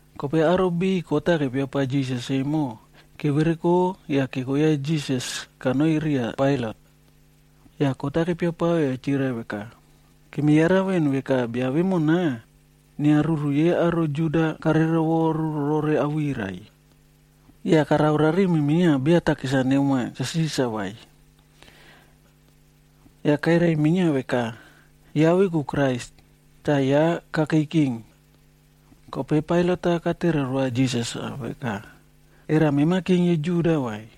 Kope aro biꞌiy kot-a kepia pao Jisas emo, kevereko yah keko ya Jisas kanoi riya Pailat.a Yah kot-a kepiapao yah chirai veka, “Kemi yaraka veꞌen veka bia vemona, inia ruru yei aro Juda kare rovoru rore awirai. Yah karao rarimi minia beya takis-a nemoa Cha Sisarb vai. Yah kairai minia veka, ya veku Krais, tah ya kakei king.” Kope Pailat-a katere roa Jisas-a veka, “Era mema king yei Juda vai?”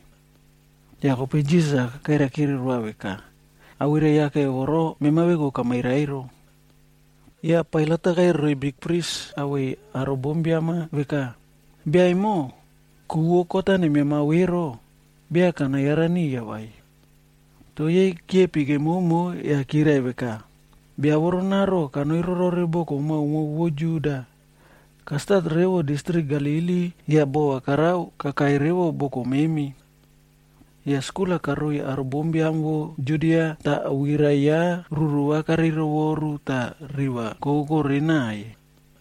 Yah kope Jisas-a kairaikire roa veka, “Awirai yake voro mema veku kamairai ero.” Yah Pailat-a kairai roiy bikpris awei aro bombiam-a veka, “Bia emo, ku vo kot-a nenianao ero, beya kana yara niya vai.” Toh yei kiepi kemomo yah kirai veka, “Bia voronaro kanoi rorore boko maomao vo Judia. Kastat revo distrik Galili yah bova karao kakai revo boko memi. Yah skul-a karao roiy aro bombiam vo Judia tah awirai ya ruru va karei rovoru tah riva kokokore naꞌaiy.”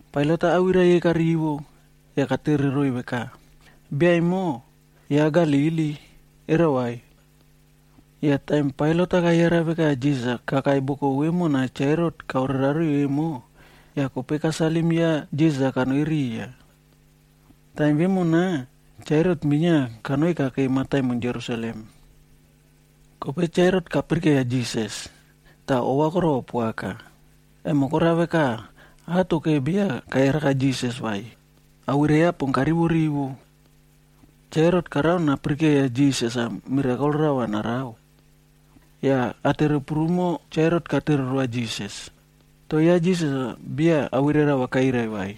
Pailat-a awirai yei karivo, yah katere roiy veka, “Bia emo, ya Galili, era vai?” Yah taim Pailat kayara veka Jisas-a kakai boko vemona Cha Herot kaore rariꞌi emo, yah kope kasalim ya Jisas-a kanoi riya. Taim vemona, Cha Herot minia kanoi kakei mataimon Jerusalem. Kope Cha Herot kapirikeiya Jisas, tah ova korova poaka, emo korao veka, atoke beya kayaraka Jisas vai, awirai ya pon karivo rivo. Cha Herot karao napirike Jisas-a mirakol-a rava narao. Yah atere prumo Cha Herot katere roa Jisas, toh ya Jisas-a beya awirai rava kairai roa vai.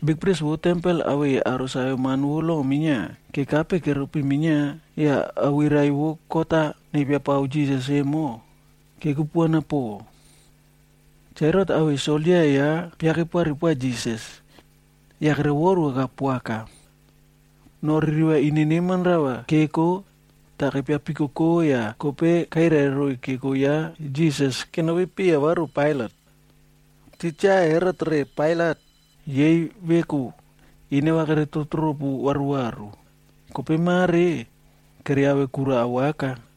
Bikpris vo tempel awei aro saveman vo lo minia kekape keropi minia yah awirai vo kot-a nepiapao Jisas emo, kekupuana po. Cha Herot awei soldia ya piakepari poa Jisas, yah kerovoruaꞌka poaka. Noreka ririva ine neman rava keko, tah kepia pikokoc yah kope kairai roiy keko ya Jisas kenopi piya varu Pailat. Titja Herot re Pailat, yei veku ineva kere tropu tropu varuvaru, kope mare, keriave kura awaka.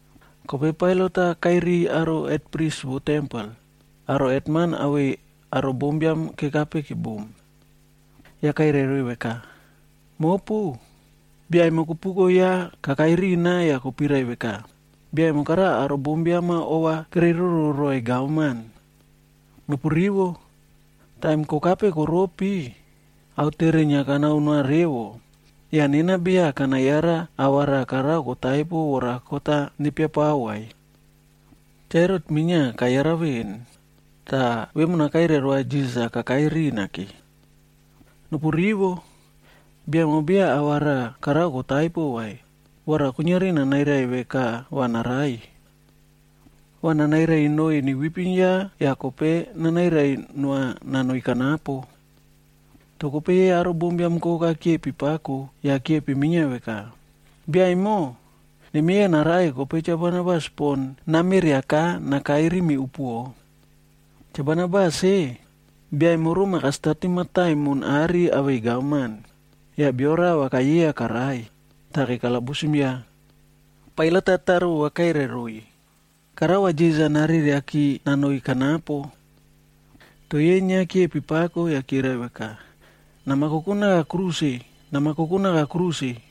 Kope Pailat-a kairiy aro bikpris vo tempel, aro hetman awei aro bombiam kekape kebum. Yah kairai roiy veka, “Mopu, bia emo kopuko ya kakai rina yah kopirai veka, bia emo karao aro bombiam-a ova kereiroro roiy gavman. Nopu rivo! Taim kokape koropi, aotere inia kanao noa revo, yah nena beya kana yara ava raꞌa karao kotaipo vora kot-a nepiapao vai. Cha Herot minia kayara veꞌen, tah vemona kairai roa Jisas-a kakai rimi ke. Nopu rivo. Bia emo beya ava raꞌa karao kotaipo vai, vora kuiniari nanairai veka va narai. Va nanairai noiy newipim ya yah kope nanairai noa nanoi kanapo.d” Toh kope yei aro bombiam koka kiepi pako yah kiepi minia veka, “Bia emo, nemieya narai kope Cha Barabas pon nameriaka nakai rimi upuoꞌo.” Cha Barabas-e, bia emo roma kastatim mataimon are awei gavman, yah bio rava kayeiya karai, tah kekalabusim ya. Pailat-a tare vova kairai roiy, karao va Jisas-a nareriaki nanoi kanapo. Toh yei inia kiepi pako yah kirai veka, “Nama koko naka kruse! Nama koko naka kruse!”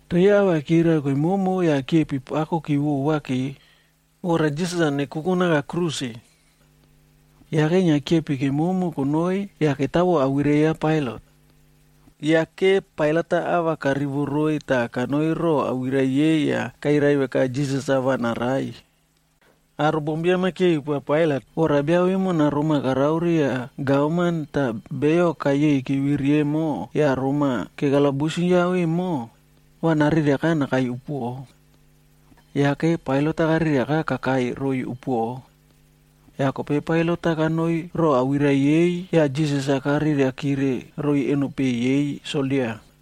Toh yei ava kirai kemomo yah kiepi pakoki vovake, vora Jisas-a nekoko naka kruse. Yake inia kiepi kemomo konoi yah ketavo awirai ya Pailat. Yake Pailat-a ava karivo roiy tah kanoi roꞌo awirai yei yah kairai veka Jisas-a va narai. Aro bombiam-a kiepi poa Pailat vora bia vemona roma karao riya gavman tah beyo kayei keviri emo yah Rom-a kekalabusim ya emo, va nariaka nakai upuoꞌo. Yake Pailat-a kareriaka kakai roiy upuoꞌo. Yah kope Pailat-a kanoi roꞌo awirai yei yah Jisas-a kareriakire roiy eno peꞌe yei soldia.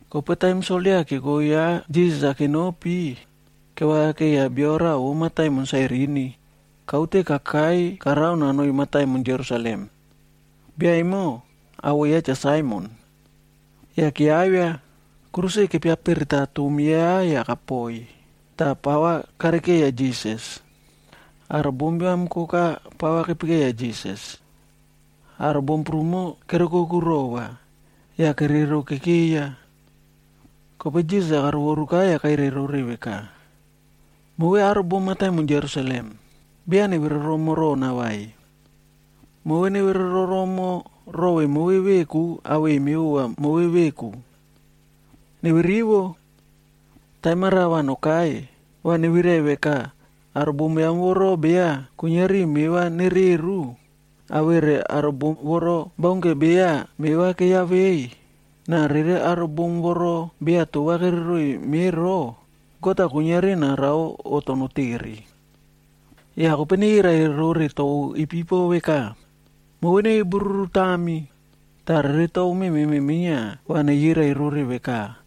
Kope taim soldia keko ya Jisas-a kenopi, kevakakeiya bia raꞌa vo mataimon Sairini, kaute kakai karao nanoi mataimon Jerusalem. Bia emo, awoꞌo ya Cha Saimon. Yah keavia, kruse kepiapereta tom yah kapoi, tah pava karekeiya Jisas. Aro bombiam koka pava kepekeya Jisas. Aro bom prumo kere oukoku rova, yah kerero kekeiya. Kope Jisas-a karovoruka yah kairai rore veka, “Move aro bom mataimon Jerusalem, beya neve roromo rona vai. Move neve roromo rove move veku awei mevova move veku. Neve rivo. Taim-a raꞌa va nokai, va nevirai veka, ‘Aro bom voro beya kuiniari meva nereru, awere aro bom voro baunke beya meva keyaveiy, na rere aro bom voro beya tova kere roiy me ro, God-a kuiniari narao oꞌto notere.’ ‘Yah kope neyirai rore tou ipipo veka, “Move neve bururu tami,” tah rere tou mememe minia va neyirai rore veka,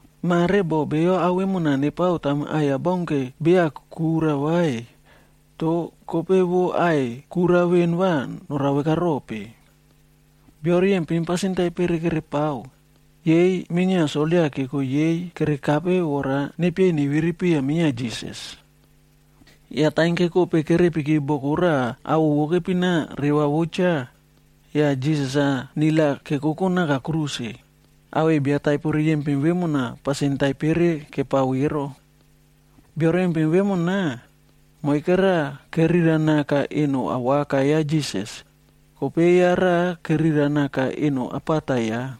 Mare boh beyo ao vemona nepao taim aꞌai baunke beya kura vai, toh kope vo aꞌai kura veꞌen va norao veka rope?”f Bio riyempin pasin taipere kerepao, yei minia soldia keko yei kerekape vora nepieiy neviri piya minia Jisas. Yah taim kekope kerepiki boko raꞌa awoꞌo vo kepina Reva vo Cha, yah Jisas-a nil-a kekoko naka kruse, awei bia taipo riyempin vemona pasin taipere kepao ero. Bio riyempin vemona, moike raꞌa kerira naka eno awaka ya Jisas, kope ya raꞌa kerira naka eno apata ya.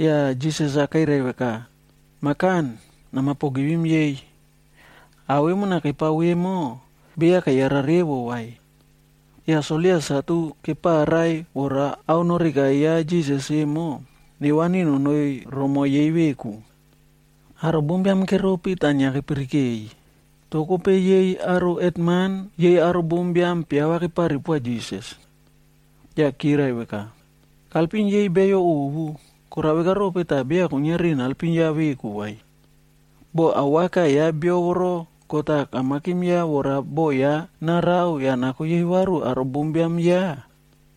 Yah Jisas-a kairai veka, “Mah Kan, nama pogivim yei. Ao vemona kepao vemo, beya keyara revo vai.” Yah soldia satu keparai vora ao noreka ya Jisas emo, nevani nonoi romoiy yei veku. Aro bombiam keropi tah inia kepirikeiy, toh kope yei aro hetman yei aro bombiam piava kepari poa Jisas. Yah kirai veka, “Kailpim yei beyo ovu, korao veka rope tah beya kainiari naelpim ya veku vai? Boh awaka ya bia voro God-a kamakim vora boꞌo ya narao yah nako yei varu aro bombiam ya,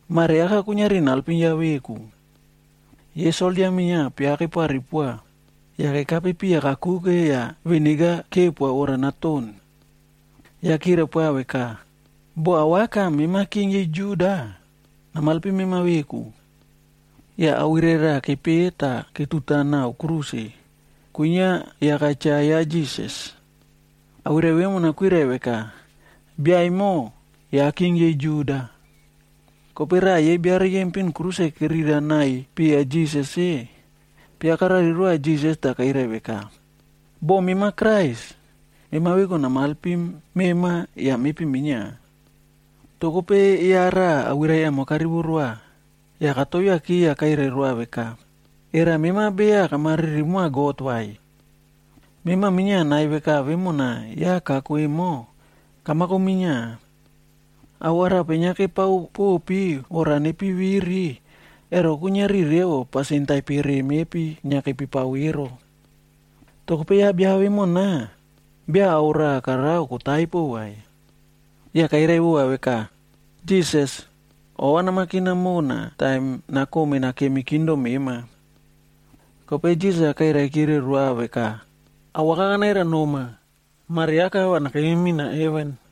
mare aka kuiniari naelpim ya veku.” Yei soldia minia piava kepari poa, yah kekape piya kakuke yah viniga kepoa vora naton. Yah kirai poa veka, “Boh awaka mema king yei Juda, namailpim mema veku.” Yah awirai raꞌa kepeꞌe tah ketuta nao kruse, kwinia yaka cha ya Jisas. Awirai vemona kwirai veka: BIA EMO YA KING YEI JUDA. Kope raꞌa yei bia riyempin kruse kerira naꞌaiy piya Jisas-e, piava karari roa Jisas tah kairai veka, “Boh mema Krais, mema veku namaelpim mema yah mepi minia!” Toh kope ya raꞌa awirai emo karivo roa, yah katoviaki yah kairai roa veka, “Era mema beya kama riri moa God vai? Mema minia nai veka vemona ya kako emo, kamako minia. Ao arape inia kepao popi vora nepi viri, ero kuiniari revo pasin taipere mepi inia kepipao ero. Toh kope ya bia vemona, beya ao raꞌa karao kotaipo vai.” Yah kairai vova veka, “Jisas, ova namakina mona taim nakome nakemi kingdom mema.” Kope Jisas-a kairaikire roa veka, “Awaka kanairai noma, mare aka va nakemi mina heven.”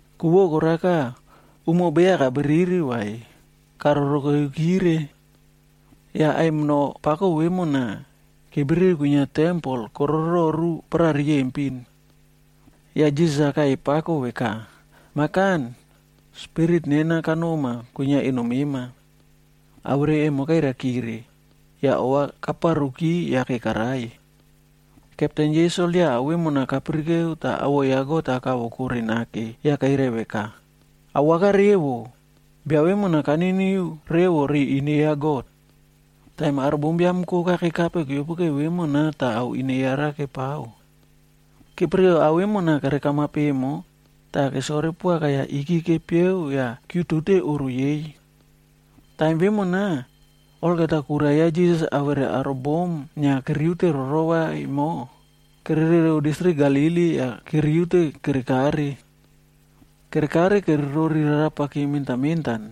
Ku vo koraka, umo beya kabriri vai, karoro keiyakire. Yah aimino pako vemona, kebriri kwinia tempel korororu paraꞌa riyempin. Yah Jisas-a kaꞌai pako veka, “Mah Kan, spirit nena kanoma kwinia eno mema.” Awirai emo kairaikire, yah ova kaparuki yake karai. Kepten yei soldia ao vemona kepirike tah awoꞌo ya God-a kavokore nake yah kairai veka, “Awaka revo, bia vemona kaniniu revo ri ine ya God.” Tah aro bombiam koka kekape keopoke vemona tah ao ine yara kepao. Kepirikere ao vemona kerekamap emo, tah kesore poaka yah iki kepieg yah kiutute oꞌro yei. Taim vemona, olgeta kura ya Jisas awere aro bom inia keriute rorova emo, kererereu distrik Galili yah keriute kerekare. Kerekare kere rori rarapaki mentan mentan,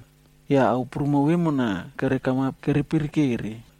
yah ao prumo vemona kere kamap kere pirikere.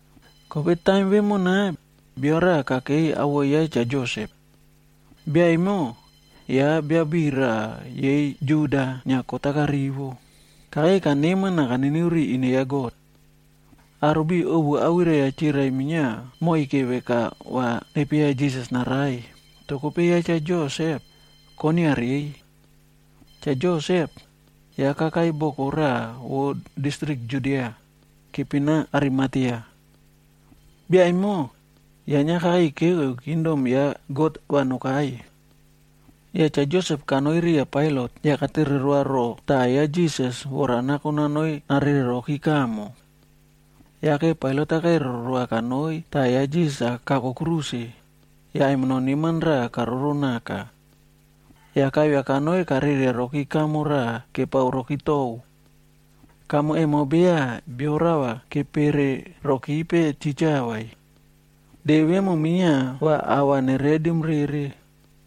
Kope taim vemona, bio raꞌa kakei awoꞌo ya Cha Josep. Bia emo, ya bia biꞌiy raꞌa yei Juda inia kot-a karivo, kakei kaneman na kaniniu ri ine ya God. Aro biꞌiy ovu awirai-a chirai minia moike veka va nepieya Jisas-a narai, toh kope ya Cha Josep, koinia reiy. Cha Josep, ya kakai boko raꞌa vo distrik Judia, kepina Arimatea. Bia emo, ya inia kakei keke kingdom ya God va nokai. Yah Cha Josep kanoi riya Pailat yah katere roa roꞌo taꞌa ya Jisas vora nako nanoi narere rokire kamo. Yake Pailat-a kairai roa kanoi taꞌa ya Jisas kako kruse, yah aimino neman raꞌa karoro naka. Yah kaivia kanoi kareriaroki kamo raꞌa kepao roki tou. Kamo emo beya bio rava kepere rokipe titja vai. De vemo minia va ava neredim rere,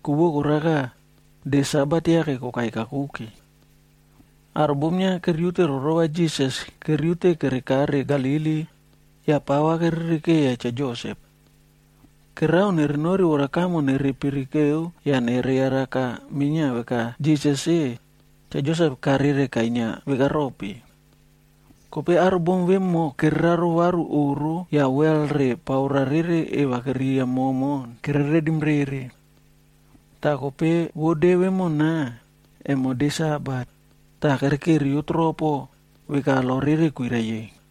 ku vo koraka, de Sabat yake kokai kakuke. Aro bom inia keriute rorova Jisas keriute kerekare Galili yah pava kere rikeiya Cha Josep. Kererao nerenori vora kamo nere pirikeu yah nere yaraka minia veka Jisas-e, Cha Josep karere kainia veka rope. Kope aro bom vemo kereraro varu oꞌro yah wel re paora rere eva keriya momon kere redim rere. Toh kope vo de vemona, emo de Sabat, tah kere keriyo tropo, veka lo rere kwirai-e.